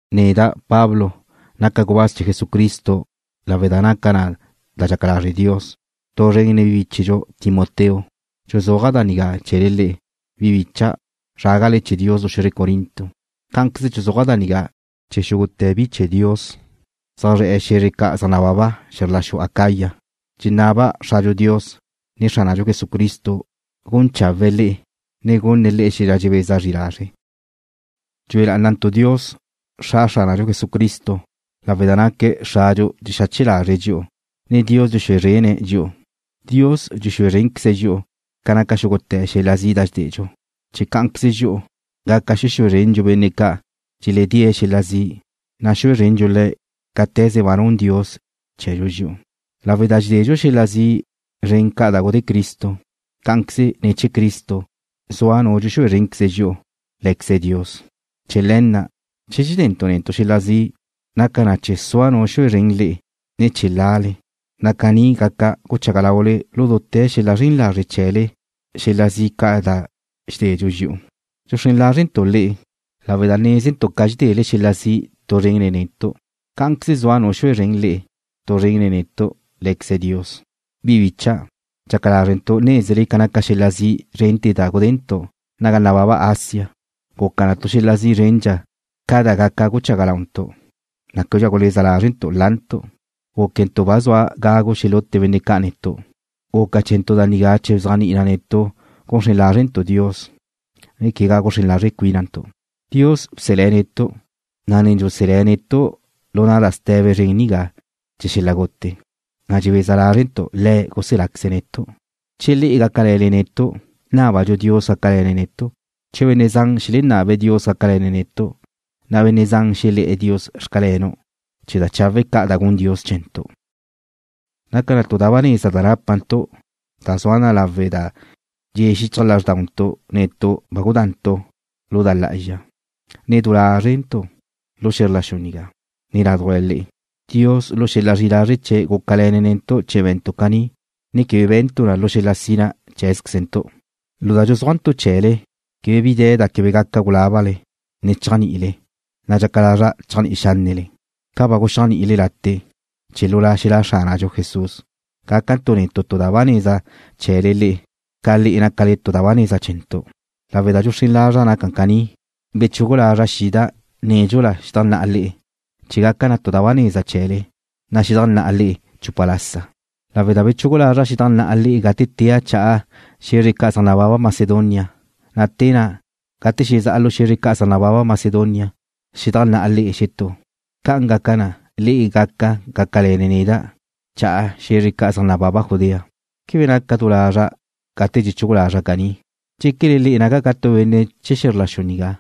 Neda', Pablo, naca' gubáz chee̱ Jesucristo lawe' da naca na da dxaca lazre' Dios. Tu zren nen bíchedxu Timoteo dxuzúaja' da nigá chee̱le le'e, bi bícha'dau', zrágale chee̱ Dios lu xe̱zre Corinto. Cá'anqueze dxuzúaja' da nigá chee̱ xúgute̱ bi chee̱ Dios zaj zre̱'e̱ xe̱zre ca' zaj nababa xe̱zr la xu Acaya. Dxenaba' Xradxu Dios, ne Xránadxu Jesucristo gun chawe̱'e̱ le'e, ne gunne̱' le'e xel-la dxebeza zri lazre'. Dxue lá'anantu' Dios, Xra Xránadxu Jesucristo, lawe' da naque̱' Xradxu dxexache lazre̱' dxi'u, ne Dios dxexúe zrene̱' dxi'u. Dios dxexúe zrénqueze̱' dxi'u ca naca xúgute̱ xel-la zi' da dxededxu, chee̱ cá'anqueze dxi'u gaca xexúe zrendxu benne' ca' dxeledée̱' xel-la zi', na' xue zrendxu le̱' cáte̱ze da ba nun Dios chee̱dxu dxi'u. Lawe' da dxededxu xel-la zi' zren ca da gudé Cristo, cá'anqueze ne̱ chee̱ Cristo zua Nu dxexúe zrénqueze dxi'u, Lé̱queze Dios. Chee̱ le̱ na', che dxedentu' netu' xel-la zi', naca na chee̱ sua Nu xexúe zren le'e, ne chee̱ lale, na' caní gaca guchaga laule lu dute̱ xel-la zren lazre' chee̱le xel-la zi' ca' da dxededxu dxi'u. Dxuxrén lázrele̱'e̱ntu' le'e, lawe' da nézentu' ca dxedele xel-la zi' tu zren nen netu', cá'anqueze sua Nu xexúe zren le'e tu zren nen netu', Lé̱queze Dios. Bi bicha', dxaca lázrentu' nézele ca naca xel-la zi' zren da gudentu' naga nababa Asia. Guca na tu xel-la zi' zrendxa ca da gaca guchaga launtu', na' québedxa guleza lázrentu' lantu'. Gúquentu' ba zua gagu xelute benne' ca' netu'. Guca chee̱ntu' da nigá chee̱ bzéajni'i na netu' guxrén lázrentu' Dios, ne quegá guxrén lazre' cuínantu'. Dios bselé̱' netu', na' ne dxuselé̱' netu' lu da ste̱be zren nigá chee̱ xel-la gute, na' dxebeza lázrentu' Le̱' guseláqueze̱' netu' che le'e gácale̱le netu', nábadxu Dios gácale̱ne̱' netu'. Che benne' zan xelenabe̱' Dios gácale̱ne̱' netu', na' benne' zan xelé̱'e̱ Dios: Xcalenu', chee̱ da chawe' ca' da gun Dios chee̱ntu'. Naca tu da ba neza da nápantu' da zua na lawe' da dxe̱ xichaj lázrdauntu' netu' ba gudantu' lu da lá'azxa, ne du lázrentu', lu xe̱zr la xu nigá, ne ládujla le'e. Dios lu xel-la zri'i lazre' chee̱' gúcale̱ne̱' netu' chee̱ be̱ntu' caní, ne quebe be̱ntu' na lu xel-la sina cheé̱zquezentu'. Lu da dxuzúajntu' chee̱le quebe bi de̱ da quebe gaca gulábale, ne chéajni'ile, na' dxaca lazra' chéajni'i xánnele ca ba guxéajni'ile late', chee̱ lu zra xelá' Xránadxu Jesús, gácantu' netu' tu da ba neza chee̱le le'e, ca le'e gácale tu da ba neza chee̱ntu'. Lawe' da dxuxrén lazra' gaca caní, bechugu lazra' xida' nédxula xedajnná'a le'e chee̱ gaca tu da ba neza chee̱le, na' xedajnná'a le'e chupa lasa, lawe' da bechugu lazra' xedajnná'a le'e gate tea' cha'a xe̱zre ca' zaj nababa Macedonia, na' te na', gate zezá'a lu xe̱zre ca' zaj nababa Macedonia, xedajnná'a le'e xetú. Ca' gaca na, le'e gaca gácale̱le neda' cha'a xe̱zre ca' zaj nababa Judea. ¿Quebe naca' du lazra' gate dxechugu lazra' caní? ¿Dxéquele le'e naca' ca tu benne' chee̱ xe̱zr la xu nigá,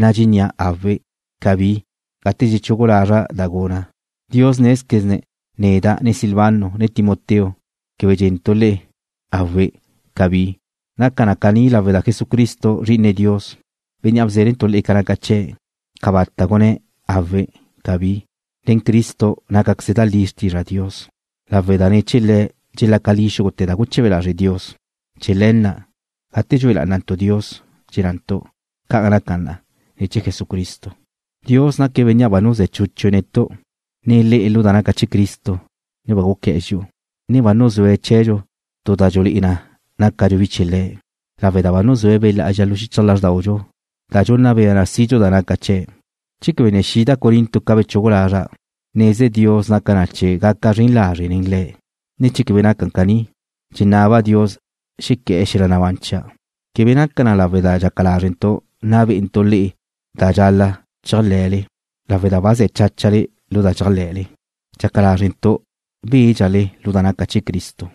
na' dxennía': Awe', cabí, gate dxechugu lazra' da guna'? Dios nézquezne̱' neda', ne Silvano, ne Timoteo, quebe dxe̱ntu' le'e: Awe', cabí. Naca na caní lawe' da Jesucristo, Zri'ine Dios, Bénnea' bzénentu' le'e ca naca chee̱', cabata' gunné̱': Awe', cabí. Nen Cristo nácaqueze da li xrtizra Dios, lawe' da ne̱ chee̱ Le̱' dxelaca li xúgute̱ da guche̱be lazre' Dios. Chee̱ le̱ na', gate dxue lá'anantu' Dios, dxennantu': ¡Ca'an naca na! ne̱ chee̱ Jesucristo. Dios naque̱' Bénnea' ba nuzé̱ chúchue̱' netu', ne le'e lu da naca chee̱ Cristo, ne ba guqué̱'e̱ dxi'u, ne ba nuzúe̱' chee̱dxu tu da dxulé'e na nácadxu bi chee̱ Le̱', lawe' da ba nuzúe̱' Be' Lá'azxa lu xichaj lázrdaudxu, da dxunna bea na sidxu da naca chee̱'. Che quebe ne xida' Corinto ca bechugu lazra', neze Dios naca na chee̱ gaca' zren lazre' nen le'e, ne che quebe naca caní, dxenaba' Dios xequé̱'e̱ xel-la nabán chia'. Quebe naca na lawe' da dxaca lázrentu' nna bé'entu' le'e da dxal-la' chéajle̱le, lawe' da ba ze̱ cháchale lu da dxéajle̱le. Dxaca lázrentu' bédxale lu da naca chee̱ Cristo.